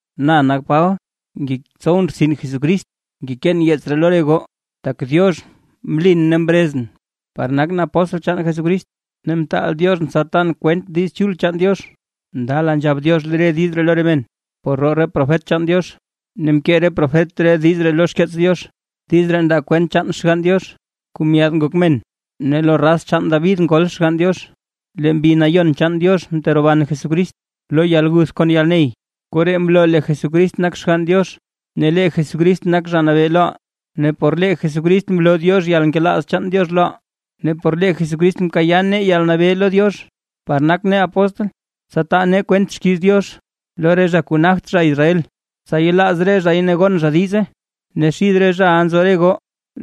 Na nak Paba ne ngetsowʼn rtsin Jesucrist. Ngekeen yeets ree lo re goo, tak Diox mlin ne mrezʼn par nakʼn apóstl chaan Jesucrist, ne mtaal Dioxʼn tsa tan kwent Diiz Chul chaan Diox. Ndala nzhab Diox re diiz ree lo re men por roo re profet chaan Diox, ne mkee re profet re diiz ree lo xkeets Diox. Diiz ree ndaa kwent chaan Xgann Diox kuu myaad ngok men, ne lo raz chaan David ngol Xgann Diox, lee Mbi Nayon chaan Diox mteroban Jesucrist lo yalguth kon yalney, koree mloo lee Jesucrist nak Xgann Diox, ne lee Jesucrist nak Zha Nabee loʼaa. Ne por lee Jesucrist mloo Diox yalnkelaaz chaan Diox loʼaa. Ne por lee Jesucrist mkayaa nee yalnabee lo Diox par nak nee apóstl, tsa taa nee kwent xkiiz Diox lo re zha kuu nagt zha Israel, tsa yelaaz re zhay ne gon zha diize. Ne xid re zhaʼa nzo re goo,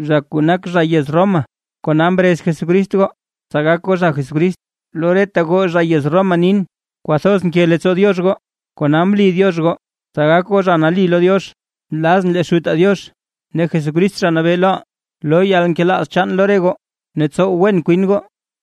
zha kuu nak zha yez Roma, kona mrez Jesucrist goo, tsa gak goo zha Jesucrist. Lo reta goo zha yez Roma nin, kwathoz nke leettsoo Diox goo, kona mli Diox goo, tsa gak goo zha nali lo Diox. Nlazʼn lee Xutaa Diox ne Jesucrist Zha Nabee loʼaa, loo yalnkelaaz chaan lo re goo ne tsow wen kwin goo.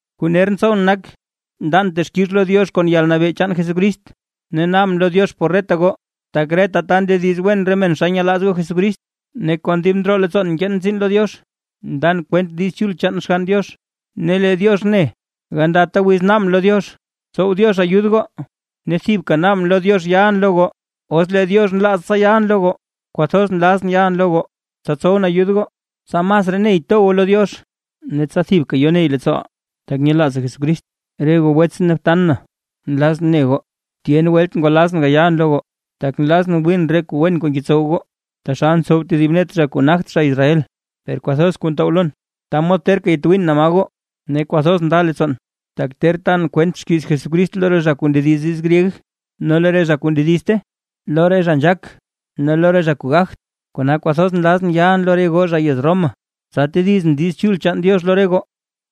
Kuu ner ntsowʼn nak, ndan texkix lo Diox kon yalnabee chaan Jesucrist, ne naabʼn lo Diox por reta goo, tak reta ta ndediz wen re men xa nyelaaz goo Jesucrist. Ne kon dib ndroo leettsoon nkeen tsiin lo Diox, ndan kwent Diiz Chul chaan Xgann Diox, ne lee Diox ne, gandata wiz naabʼn lo Diox, tsow Diox ayud goo. Ne thibka naabʼn lo Diox yalʼn lo goo, os lee Diox nlaaz Diox tsa yalʼn lo goo. Kwathoz nlazʼn yalʼn lo goo, tsa tsowʼn ayud goo, tsa masraa ney to goo lo Diox. Ne tsa thibka yo ney leettsooʼaa, tak nyelaazaa Jesucrist. Re goo wetsʼn ne btan na, nlazʼn ne goo tyen welt ngwalazʼn gayalʼn lo goo, tak nlazʼn wiin re kuu wen kuu ngetsow goo, taxal ntsow tedib net re zha kuu nagt zha Israel. Per kwathoz kuu ntow lon ta mod terka yatwiin naa ma goo. Ne kwathoz nda leettsoon, tak ter tan kwent xkiiz Jesucrist lo re zha kuu ndediz diiz gryeg ne lo re zha kuu ndedizte, lo re zha nzhaak ne lo re zha kuu gagt. Kona kwathoz nlazʼn yalʼn lo re goo zha yez Roma, tsa tedizʼn Diiz Chul chaan Diox lo re goo.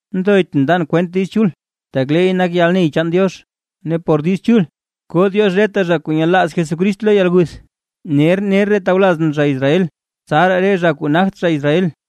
Nthoytʼn ndan kwent Diiz Chul, tak leey nak yalney chaan Diox, ne por Diiz Chul koo Diox reta zha kuu nyelaaz Jesucrist lo yalguth, ner ner re tawlazʼn zha Israel, tsaraa re zha kuu nagt zha Israel.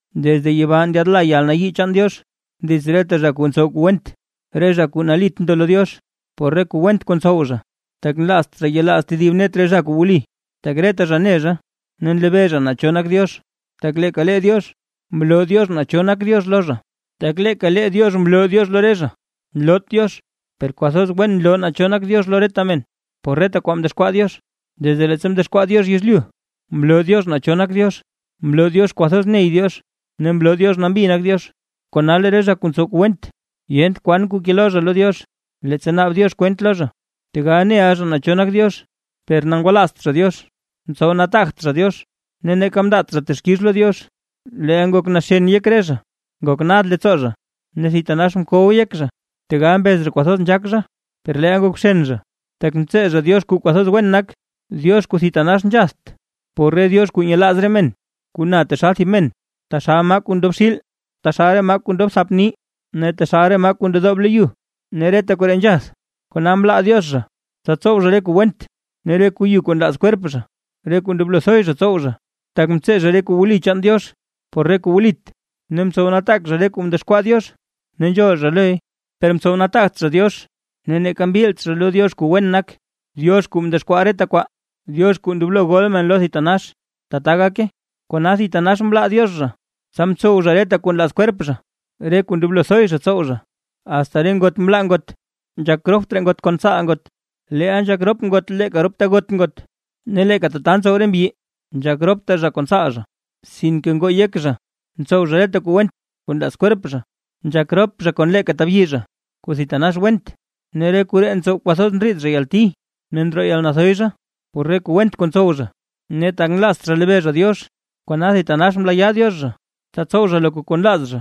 Desde yibaa ndyaadla yalnayii chaan Diox, dits reta zha kuu ntsow kuu went, re zha kuu nalit ndo lo Diox, por re kuu went kuu ntsow zha, tak nlaazt zha yelaaz tedib net re zha kuu wli. Tak reta zha ne zha ne nlebee zha naa cho nak Diox, tak leeka lee Diox mloo Diox naa cho nak Diox lo zha, tak leeka Diox mloo Diox lo re zha. Nloot Diox, per kwathoz wen nloo naa cho nak Diox lo reta men, por reta kwaa mdexkwaa Diox. Tak desde leettsa mdexkwaa Diox yezlyu, mloo Diox naa cho nak Diox, mloo Diox kwathoz ney Diox ne mloo Diox nambi nak Diox. ¡Kona lee re zha kuu ntsow kuu went, yent kwan kuu kelo zha lo Diox, leettsa naab Diox kwent lo zha! Tegal neʼa zha naa cho nak Diox per ngwalaazt zha Diox, mtsow nataagt zha Diox ne neeka mndaat zha texkix lo Diox, leel ngok naxen yek re zha, ngok nad leettsoo zha ne thitanax mkow yek zha. Tegal mbez zha kwathoz nzhaak zha, per leel ngok bxen zha, tak mtsee zha Diox kuu kwathoz wen nak, Diox kuu thitanax nzhatht, por re diox kuu nyelaaz re men kuu na taxal thib men, taxal maa kuu ndob xiil, taxal re maa kuu ndob thap nii, ne taxal re maa kuu ndedoob lo yu, ne reta koree nzhath. Kona mlaa Diox zha, tsa tsow zha re kuu went ne re kuu yu kuu nlaaz kwerp zha, re kuu ndoblo thoy zha tsow zha. Tak mtsee zha re kuu wli chaan Diox por re kuu wlit, ne mtsow nataak zha re kuu mdexkwaa Diox ne nzhool zha loy, per mtsow nataagt zha Diox ne neeka mbilt zha lo Diox kuu wen nak, Diox kuu mdexkwaa reta kwaa, Diox kuu ndoblo gol men lo thitanax. ¡Tata gake! Kona thitanax mlaa Diox zha, tsa mtsow zha reta kuu nlaaz kwerp zha, re kuu ndoblo thoy zha tsow zha. Asta re ngot mlaa ngot nzhak ropt raa ngot kon tsaal ngot, leel nzhak rop ngot leeka rop tagot ngot. Ne leeka tata ntsow re mbyi, nzhak ropt raa zha kon tsaal zha. Sinke ngoo yek zha ntsow zha reta kuu went kuu nlaaz kwerp zha, nzhak rop zha kon leeka tabyi zha, thib kuu thitanax went. Ne re koree ntsow kwathoz ndriid zha yalti ne ndroo yalnathoy zha, por re kuu went kuu ntsow zha. Ne tak nlaazt zha lebee zha Diox, kona thitanax mlaayaa Diox zha, tsa tsow zha loka kuu nlaaz zha,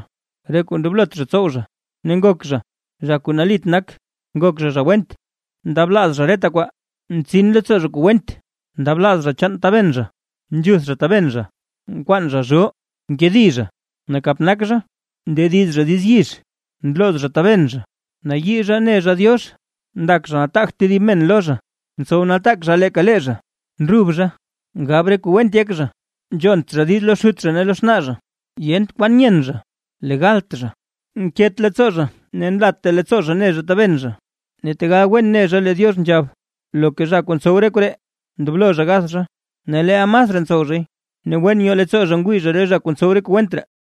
re kuu ndoblot zha tsow zha. Ne ngok zha: zha kuu nalit nak, ngok zha zha went, ndablaaz zha reta kwaa, ntsin leettsoo zha kuu went, ndablaaz zha chaan taben zha, nzhuth zha taben zha, nkwaan zha zhoo, nkedi zha, nakap nak zha, ndediz zha diiz yizh. Nlooz zha taben, nayii zha ne zha Diox, ndak zha nataagt tedib men lo zha, ntsow nataak zha leeka lee zha, ndrub zha, ngab re kuu went yek zha, nzhont zha diiz lo xut zha ne lo xnaa zha. Yent kwan nyen zha, legalt zha, nket leettsoo zha ne nlatta leettsoo zha ne zha taben zha. Ne tegal wen ne zha lee Diox nzhab: “Loka zha kuu ntsow re koree ndoblo zha gath zha”. Ne leel masraa ntsow zhay, ne wen nyoo leettsoo zha ngwii zha re zha kuu ntsow re kuu went ree.